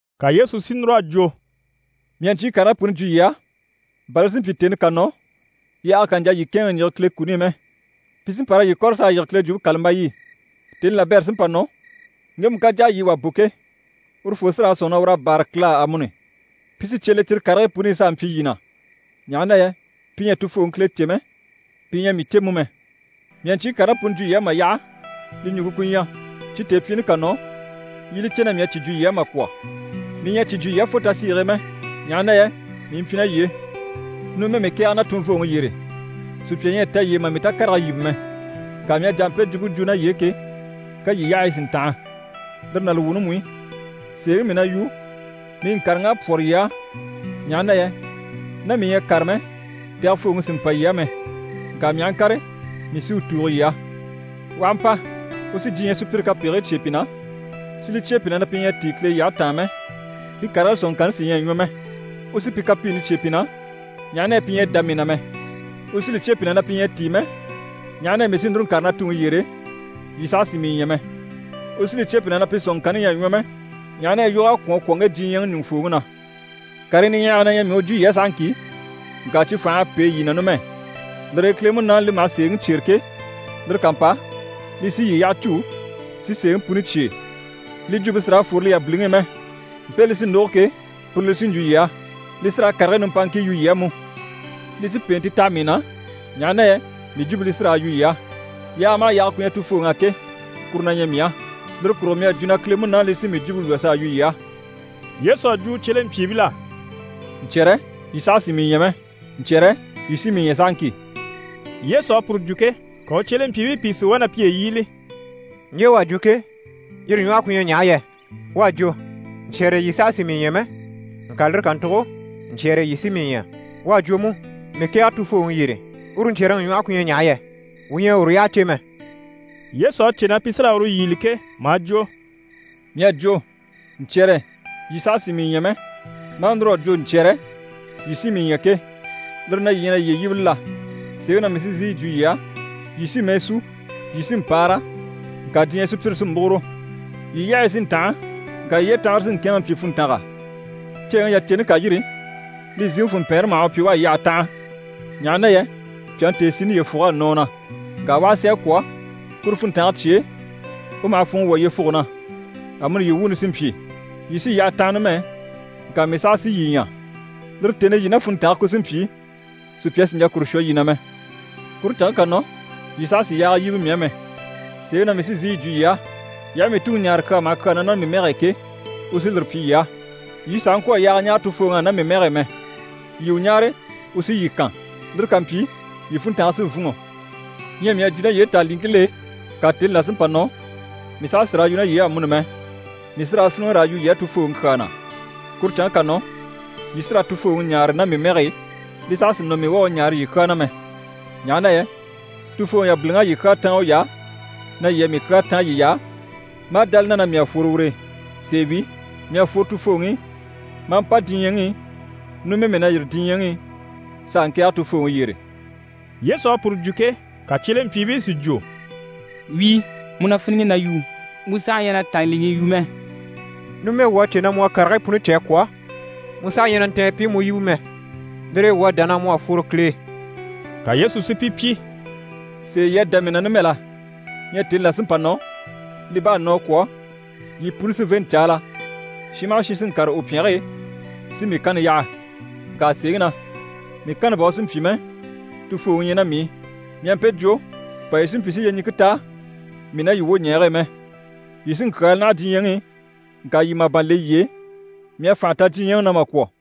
Ka Yesu si núr'à jwo: «Mii à ɲcyii karigii puni jwo yii á, bà li si mpyi, tèni ká nɔ, yaaga kà ɲjà yii kɛ̂ɛnŋɛ ɲjige Kile kuni i mɛ. Pi sí n‑pa raa yii kɔ̀re s'a yige Kile Jwumpe kàlambayi i. Tèni labɛrɛ sí n‑pa nɔ, ŋgemu ká jà a yii wà bò ke, urufoo sí raa sɔ̂nŋi na ur'à báara Kile á amuni. Pi sí cye le cyire karigii puni i s'a mpyi yii na, ɲaha na yɛ pi ɲyɛ a Tufooŋi Kile cè mɛ, pi ɲyɛ a mii cè mú mɛ. Mii à ɲcyii karigii puni jwo yii á mà yaha, li ɲùŋke ku ɲyɛ cyi tèepyiini ká nɔ, yii i li cè na mii à cyi jwo yii á mà kwɔ̀. Mii ɲyɛ a cyi jwo yii á fo tasiige e mɛ, ɲaha na yɛ mii mpyi ná yii e. Numɛ mii kɛ̀ɛge na tunvooŋi yyére, sùpya ɲyɛ a ta yii e mà mii takarege yíbe mɛ. Ŋka mii à jà a mpe jwumpe jwo ná yii e ke, ka yii yyahayi si ntanha. Lire ná li wuuni mú i, sèeŋi mii na yu, mii ŋkàreŋ'à pwɔ́rɔ yii á, ɲaha na yɛ ná mii ɲyɛ a kàre mɛ, Tɛgɛfooŋi sì n‑pa yii á mɛ. Ŋka mii aha ŋkàre, mii sí u tùugo yii á. U aha mpa, u sí diɲyɛ sùpyire kapegigii cyêe pi na, si li cyêe pi na na pi ɲyɛ a tíi Kile yyahe taan mɛ, pi karigii sɔ̀nŋɔŋkanni sí ɲyɛ a ɲwɔ mɛ. U sí pi kapiini cyêe pi na, ɲaha na yɛ pi ɲyɛ a dá mii na mɛ. U sí li cyêe pi na na pi ɲyɛ a tíi mɛ, ɲaha na yɛ mii sí núru n‑kàre na Tuŋi yyére, yii saha sì mii ɲya mɛ. U sí li cyêe pi na na pi sɔ̀nŋɔŋkanni ɲyɛ a ɲwɔ mɛ, ɲaha na yɛ yog'à kwɔ̀n a kwɔ̀ ŋge diɲyɛŋi ɲùŋufooŋi na. Karii niɲyahagii na ɲyɛ mii u jwo yii á sahaŋki, ŋka cyi fành'à pêe yii na numɛ. Lire e Kile Munaani li maha sèeŋi cyêre ke, lire ká mpa, li sí yii yyaha cû, si sèeŋi puni cyêe. Li jwumpe sì raa fworo li yabiliŋi i mɛ. Mpe li sí n‑lógo ke, puru li sí n‑jwo yii á. Li sí raa karigii nimpaaŋkii yu yii á mú. Li sí pèente taha mii na, ɲaha na yɛ mii jwumpe li sí raa yu yii á. Yaaga maha yaaga ku ɲyɛ Tufooŋi á ke, kuru na ɲyɛ mii á. Lire kurugo mii à jwo na Kile Munaani li sí mii jwumpe lwɔ́ s'a yu yii á.» Yesu à jwo u cyelempyiibil'á: «Ɲcyɛ̀rɛ, yii saha sì mii ɲya mɛ. Ɲcyɛ̀rɛ, yii sí mii ɲya sahaŋki.» Yesu à puru jwo ke, ka u cyelempyiibii pìi si wá na piye yíbili: «Ɲje u à jwo ke, yire ɲwɔhe ku ɲyɛ ɲaha yɛ? U à jwo “Ɲcyɛ̀rɛ yii saha sì mii ɲya mɛ, ŋka lire kàntugo, ɲcyɛ̀rɛ yii sí mii ɲya.” U à jwo mú “Mii kɛ̀ɛge Tufooŋi yyére.” Uru ɲcyɛ̀rɛŋi ɲwɔhe ku ɲyɛ ɲaha yɛ? Wuu ɲyɛ a uru yyaha cè mɛ.» Yesu à cè na pi sí raa uru yíbili ke, maa jwo: «Mii à jwo “Ɲcyɛ̀rɛ yii saha sì mii ɲya mɛ, maa núr'a jwo ɲcyɛ̀rɛ yii sí mii ɲya ke” lire na yii na yiye yíbili la? Sèeŋi na mii sí n‑sìi yi jwo yii á, yii sí mɛɛ sú, yii sí n‑paara, ŋka diɲyɛ sùpyire sí múguro. Yii yyahayi sí n‑tanha, ŋka yii yyetanhare sí n‑kɛ̂ɛnŋɛ mpyi funntanga. Ceeŋi yaceni ká yîri, li ziŋi funmpɛɛnre maha u pyi u a yyahe tanha, ɲaha na yɛ pyàŋi tèesini yyefug'à nɔ u na. Ŋka u aha si a kwɔ̀, kuru funntange cye e, u maha funŋɔ wwɔ̀ yyefuge na. Amuni yii wuuni sí n‑pyi. Yii sí yyaha tanha numɛ, ŋka mii saha sí yii ɲya. Lire tèni i, yii ná funntange ku sí n‑pyi, sùpya sì n‑jà kuru shwɔ yii na mɛ. Kuru canŋke ká nɔ, yii saha sì yaaga yíbe mii á mɛ. Sèeŋi na mii sí n‑sìi yi jwo yii á, yii aha mii Tuŋi ɲáare kyaa maha kyaa na ná mii mɛge e ke, u sí lire pyi yii á. Yii sàha ŋkwɔ̀ a yaaga ɲáare Tufooŋi á ná mii mɛge e mɛ. Yii u ɲáare, u sí yii kan. Lire ká mpyi, yii funntange sí n‑fûnŋɔ. Ɲyɛ mii à jwo ná yii e tàanliŋkil'e, ŋka tèni là sí n‑pa nɔ, mii saha sì raa yu ná yii e amuni mɛ, mii sí raa fíniŋi raa yu yii á Tufooŋi kyaa na. Kuru canŋke ká nɔ, yii sí raa Tufooŋi ɲáare ná mii mɛge e, li saha sì nɔ mii u a u ɲáare yii kyaa na mɛ. Ɲaha na yɛ Tufooŋi yabiliŋ'à yii kyaa táan uy'á, na yii á mii kyaa táan yiy'á, maa dá li na na mii à fworo ur'e. Sèe wi, mii à fworo Tufooŋi i, maa mpa diɲyɛŋi i, numɛ mii na yîri diɲyɛŋi i s'a ŋkɛ̀ɛge Tufooŋi yyére.» Yesu à puru jwo ke, ka cyelempyiibii si jwo: «Wíi, mu na fíniŋi na yu, mu saha ɲyɛ na tàanliŋii yu mɛ. Numɛ wuu à cè na mu à karigii puni cè a kwɔ̀, mu saha ɲyɛ na ntɛ̀n pi i mu yíbe mɛ, lire e wuu à dá na mu à fworo Kile e.» Ka Yesu si pi pyi: «Sèe yii à dá mii na numɛ la? Ɲyɛ tèni là sí n‑pa nɔ, li bá à nɔ a kwɔ̀, yii puni sí n‑fê n‑caala, shin maha shin sí n‑kàre u pyɛnge e, si mii kanni yaha. Ŋka sèeŋi na, mii kanni bà u sì n‑pyi mɛ, Tufooŋi ɲyɛ ná mii i. Mii à mpe jwo, bà yii si mpyi si yyeɲiŋke ta mii ná yii wwoɲɛɛge e mɛ. Yii sí n‑kyaala naha diɲyɛŋi i, ŋka yii màban le yiye e, mii à fànha ta diɲyɛŋi na mà kwɔ̀.»